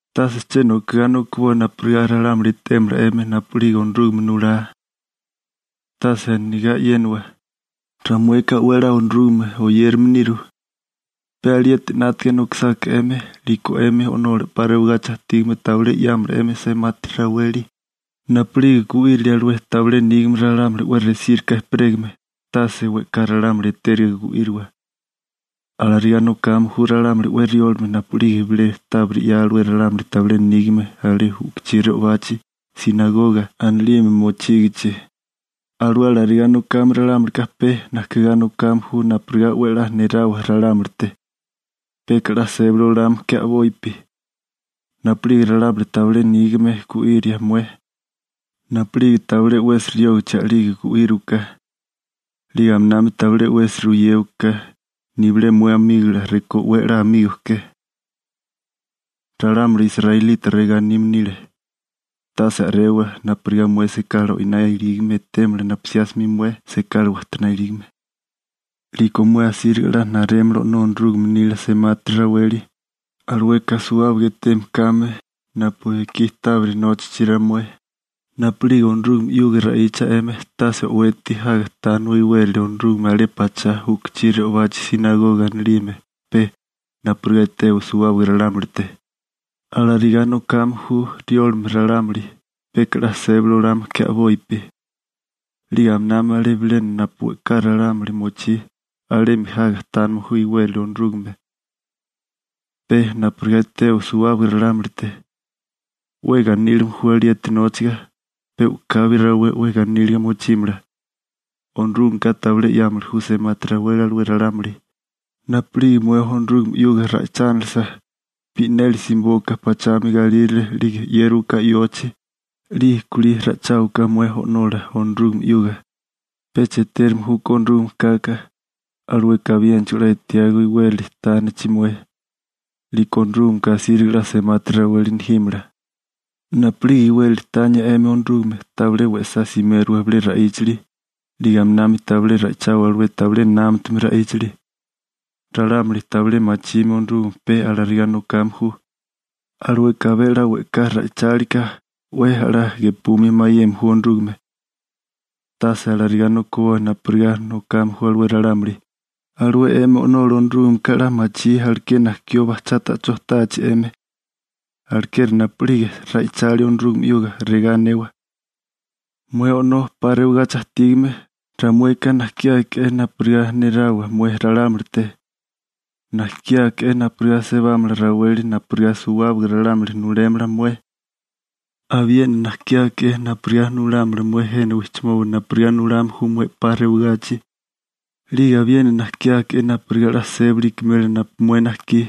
› Tase che nokigá nokiboa napurigá ralámuli etémala 'emi napu'lige Onorúgame nulá. Tase anigá e'yénawa: «Ramueka 'we a'lá Onorúgame oyérame niru.» Pe alieti 'nátaga nokisáká 'emi, 'liko 'emi O'nola 'pa rewagachi ajtígame tabilé 'yámala 'emi semati raweli. Napu'lige gu'írilia alué tabilé nígame ralámuli 'we resíriká ejperégame, tase we'ká ralámuli etériga gu'íriwa. Alarigá nokame ju ralámuli 'we riólame napu'lige bilé tábiri 'ya alué ralámuli tabilé nígame alé u'kuchí re'obachi «sinagoga» anilime mochígichi. Alué alarigá nokame ralámulika pe najkigá nokame ju napurigá 'we a'lá nerawa ralámulite. Peka 'la sébali olame ke a'bopi. Napu'lige ralámuli tabilé nígame gu'íria mué, napu'lige tabilé 'wesi riógachi a'lige gu'íriwaká. 'Lige aminami tabilé 'wesi ruyéwaká, nibilé mué amígola rekó 'we a'lá amigo ke. (Ralámuli israelita regá anime nile: «Tase a'rewa napurigá mué sekala o'iná ilígame etémala napu 'siá 'smi mué sekala wajtoná ilígame.») 'Liko mué asíriga 'la narémala O'nó Onorúgame nila semati raweli, alueka suwábaga eteme kame napu ekí tábiri nóchachi ramué. › Napu'lige Onorúgame 'yuga ra'icha 'emi, tase o'weti jaga tániwa iwérali Onorúgame alé pachá u'kuchí re'obachi «sinagoga» anilime pe napurigá etewa suwábaga ralámulite. Alarigá nokame ju riólame ralámuli, peka 'la sébali olame ke a'bopi. 'Lige aminami alé bilena napu we'ká ralámuli mochí, alemi jaga tánime ju iwérali Onorúgame, pe napurigá etewa suwábaga ralámulite. 'We ganílime ju alieti nóchaga. pe u'kabi rawé 'we ganíliga mochímala, Onorúgameka tabilé 'yámili ju semati raweli alué ralámuli. Napu'lige mué Onorúgame 'yuga ra'ichánalasa, bi'neli simibóká pachami galírale 'lige 'yérawaká yochi, 'lige kulí ra'icháwaka mué O'nola Onorúgame 'yuga. Pecha etérame júkó Onorúgame kaka, alueka abiénachigo 'la etiágó iwérali tánachi mué, 'liko Onorúgameka asíriga 'la semati raweli nejímala. › Napu'lige iwérali tania 'emi Onorúgame, tabilé we'sá simérawa bilé ra'íchali, 'lige aminami tabilé ra'ichawa alué tabilé námatame ra'íchali. Ralámuli tabilé machime Onorúgame pe alarigá nokame ju. Alueka abé 'la we'ká ra'ichálika 'we a'lá gepumia mayeme ju Onorúgame. Tase alarigá nokiboa napurigá nokame ju alué ralámuli. Alué 'emi O'nola Onorúgameka 'la machí aleké najkió bajchá ta'chó táachi 'emi. Alekeri napu'lige ra'ichalia Onorúgame 'yuga, regá anewa: Mué O'nó 'pa rewagachi ajtígame, ramueka najkiáke'é napurigá nerawa mué ralámulite, najkiáke'é napurigá sebámala raweli napurigá suwábaga ralámuli nulémala mué. Abiena najkiáke'é napurigá nulámala mué jena wijchimoba napurigá nulame ju mué 'pa rewagachi. 'Lige abiena najkiáke'é napurigá 'la sébali ikimela napu mué najkí.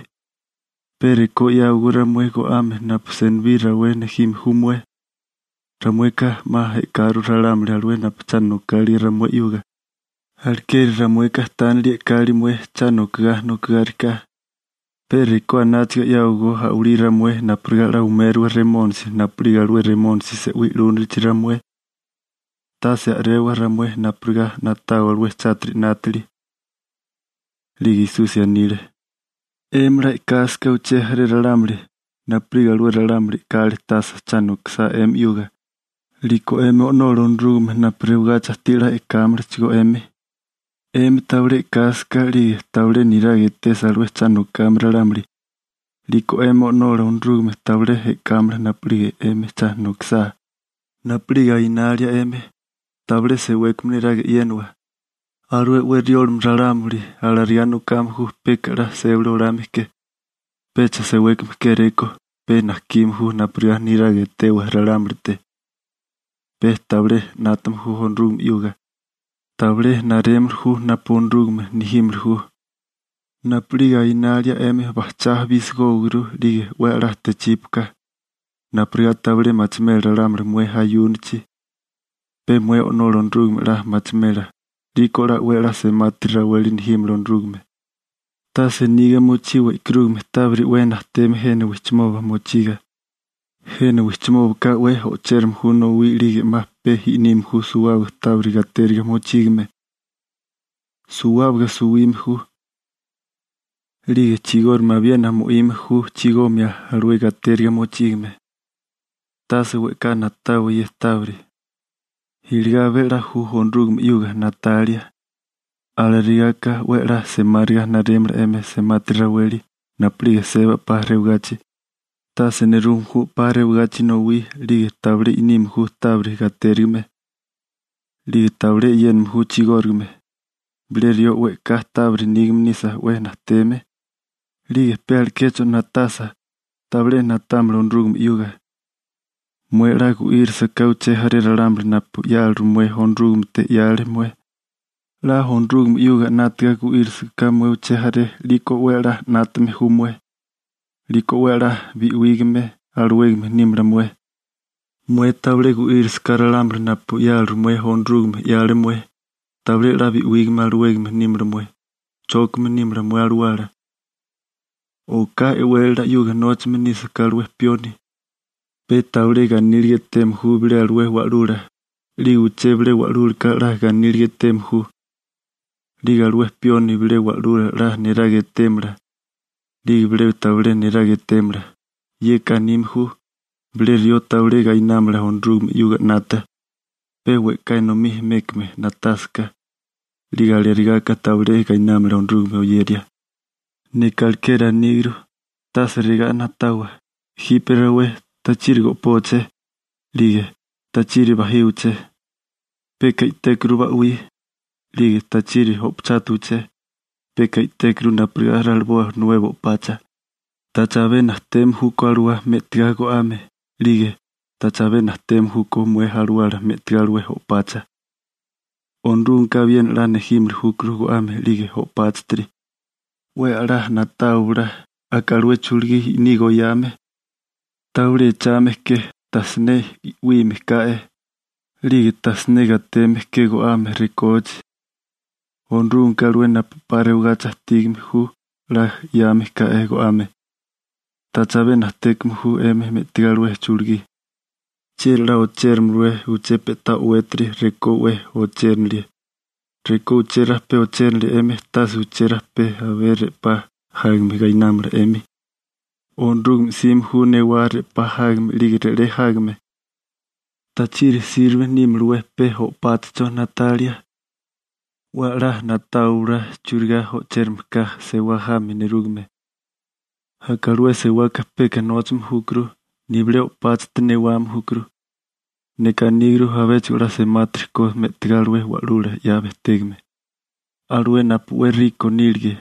Pe rekó 'yáwagó ramué go'ame napu senibí rawé nejime ju mué. Ramueka 'ma e'karu ralámuli alué napu cha nokálige ramué 'yuga, alekeri ramueka tánili e'kali mué cha nokogá nokigáriká. Pe rekó anáchaga 'yáwagó a'walí ramué napurigá 'la umérowa Remónisi napu'lige alué Remónisi se'wí 'lúnilichi ramué. Tase a'rewa ramué napurigá na'tawa alué chátiri 'nátili. 'Lige Esusi anile: ―'Emi 'la e'kásaká uché jaré ralámuli napu'lige alué ralámuli e'káali tasa cha nokisá 'emi 'yuga, 'liko 'emi O'nola Onorúgame napu rewagachi ajtí 'la e'kámalachigó 'emi. 'Emi tabilé e'kásaká 'lige tabilé niraga etesa alué cha nokame ralámuli, 'liko 'emi O'nola Onorúgame tabilé e'kámala napu'lige 'emi cha nokisá. › Napu'lige ayunalia 'emi, tabilé sewékame neraga e'yénawa. Alué 'we riólame ralámuli alarigá nokame ju peka 'la sébali olame ke, pecha sewékame kéréko, pe najkime ju napurigá niraga etewa ralámulite. Pe tabilé 'nátame ju Onorúgame 'yuga. Tabilé narémili ju napu Onorúgame nejímili ju. Napu'lige ayunalia 'emi bajchá bisigówaguru 'lige 'we a'lá techípuaka, napurigá tabilé machimela ralámuli mué ayúnachi, pe mué O'nola Onorúgame 'la machimela, 'liko 'la 'we 'la semati raweli nejímala Onorúgame. › Tase niga mochiwa e'karúgame tábiri 'we najteme jena wijchimoba mochiga, jena wijchimóbaka 'we o'chérame ju nowí 'lige 'ma pe i'nime ju suwábaga tábiri gatériga mochígame. Suwábaga suwime ju. 'Lige chigórigame abiena mo'ime ju chigomia alué gatériga mochígame. Tase we'ká na'tawa ye tábiri, iligá abé a'lá ju Onorúgame 'yuga na'talia. Alarigáká 'we a'lá semáriga narémala 'emi semati raweli napu'lige seba 'pa rewagachi. Tase nerume ju 'pa rewagachi nowí, 'lige tabilé i'nime ju tábiri gatérigime, 'lige tabilé e'yéname ju chigórigame. Bilé rió we'ká tábiri nígame nisa 'we najteme, 'lige pe alekecho na'tasa, tabilé na'támala Onorúgame 'yuga. › Mué 'la gu'írisaká uché jaré ralámuli napu 'yáliru mué Onorúgamete 'yale mué, 'la Onorúgame 'yuga 'nátaga gu'írisaká mué uché jaré, 'liko 'we a'lá 'nátame ju mué, 'liko 'we a'lá bi'wígame alawégame nímala mué. Mué tabilé gu'írisaká ralámuli napu 'yáliru mué Onorúgame 'yale mué, tabilé 'la bi'wígame alawégame nímala mué. Chókame nímala mué alawala. › Oká e'wélala 'yuga nóchame nísaká alué pioni, pe tabilé ganíliga eteme ju bilé alué wa'lula, 'lige uché bilé wa'lúlaka 'la ganíliga eteme ju. 'Lige alué pioni bilé wa'lula 'la niraga etémala, 'lige bilé tabilé niraga etémala. Yeka anime ju: Bilé rió tabilé gainámala Onorúgame 'yuga 'nata, pe we'ká enomí mékame na'tásaká. 'Lige alarigáká tabilé gainámala Onorúgame oyeria. › Neka alekeri aníguru: Tase regá na'tawa: «Jipe rawé ¿tachiri go'póaché?, 'lige ¿tachiri bajíwaché?, peka i'tékuru ba'wí. 'Lige ¿tachiri o'pachátuwaché? Peka i'tékuru napurigá raliboa nuebo o'pacha.» ¿Tacha abé najteme júkó alawá me'tigá go'ame? 'Lige ¿tacha abé najteme júkó mué alawala me'tigá alué o'pacha? Onorúgameka abiena 'la nejímili júkuru go'ame 'lige o'páchatiri. 'We a'lá na'táwabala aka alué chulugí i'niga oyame: tabilé echame ke, tajsiné 'wime ka'e, 'lige tajsiné gateme ke go'ame rekóachi. Onorúgameka alué napu 'pa rewagachi ajtígame ju 'la 'yame ká'é go'ame. ¿Tacha abé najtékame ju 'emi me'tigá alué chulugí? ¿Chieri 'la ochéramalawé uché pe'tá o'wétiri rekó 'we ochérinilie? Rekó uché rajpé ochérinilie 'emi, tase uché rajpé abé re'pá jágame gainámala 'emi. Onorúgame 'sime ju newá re'pá jágame 'lige re'lé jágame. › ¿Tachiri sirbe nímalawé pe o'páchacho na'talia? 'We a'lá na'táwabala churigá o'chérame ka sewá jami nerúgame. Aka alué sewaka peka nóchame júkuru, nibilé o'páchati newame júkuru. Neka aníguru abéchigo 'la semátiri ko me'tigá alué wa'lula 'ya bejtégame. Alué napu 'we nígame nílige,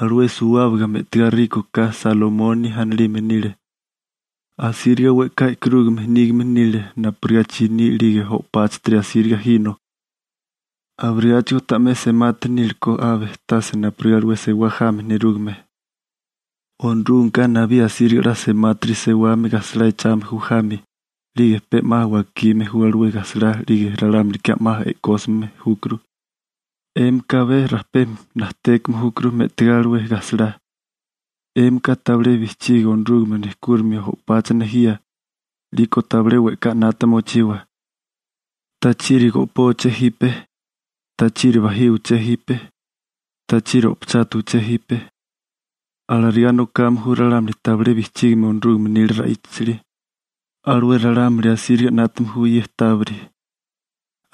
alué suwábaga me'tigá 'we nígame ka Salomoni anilime nile. Asíriga we'ká e'karúgame nígame nile napurigá chiní 'lige o'páchatiri asíriga jino, abirigáchigo ta'mé semati nílekó abe tase napurigá alué sewá jami nerúgame. Onorúgameka nabí asíriga 'la semátiri sewame gajsalá echame ju jami, 'lige pe 'ma wakime ju alué gajsalá 'lige ralámulika 'ma e'kósime júkuru. 'Émika abé rajpé najtékame júkuru me'tigá alué gajsalá. 'Émika tabilé bijchigi Onorúgame nejkúrimio o'pacha nejía. 'Liko tabilé we'ká 'nata mochiwa: «¿Tachiri go'póbeché jipe? ¿Tachiri bajíwaché jipe? ¿Tachiri o'pachátawaché jipe?» Alarigá nokame ju ralámuli tabilé bijchígime Onorúgame nila ra'íchali. Alué ralámuli asíriga 'nátame ju ye tábiri.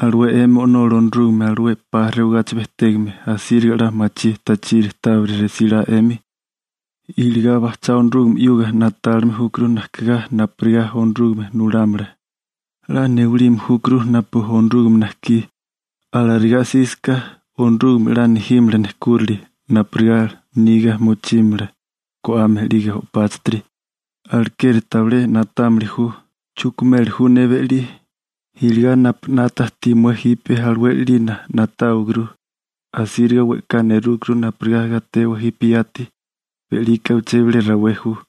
Alué 'emi O'nola Onorúgame alué 'pa rewagachi bejtégame, asíriga 'la machí tachiri tábiri resílá 'emi. Iligá bajchá Onorúgame 'yuga na'tálime júkuru najkigá napurigá Onorúgame nulámala. 'La newalime júkuru napu Onorúgame najkí. Alarigá olásaká 'emi Onorúgame 'la nejímala nejkúrali napurigá niga mochímala go'ame 'lige o'páchatiri. Alekeri tabilé na'támili ju: «Chukimeli ju ne be'lí.» Iligá napu 'nata ajtí mué jipe alué 'lina na'táwaguru. Asíriga we'ká nerúkuru napurigá gatewa jipe yati. Be'lika uché bilé rawé ju.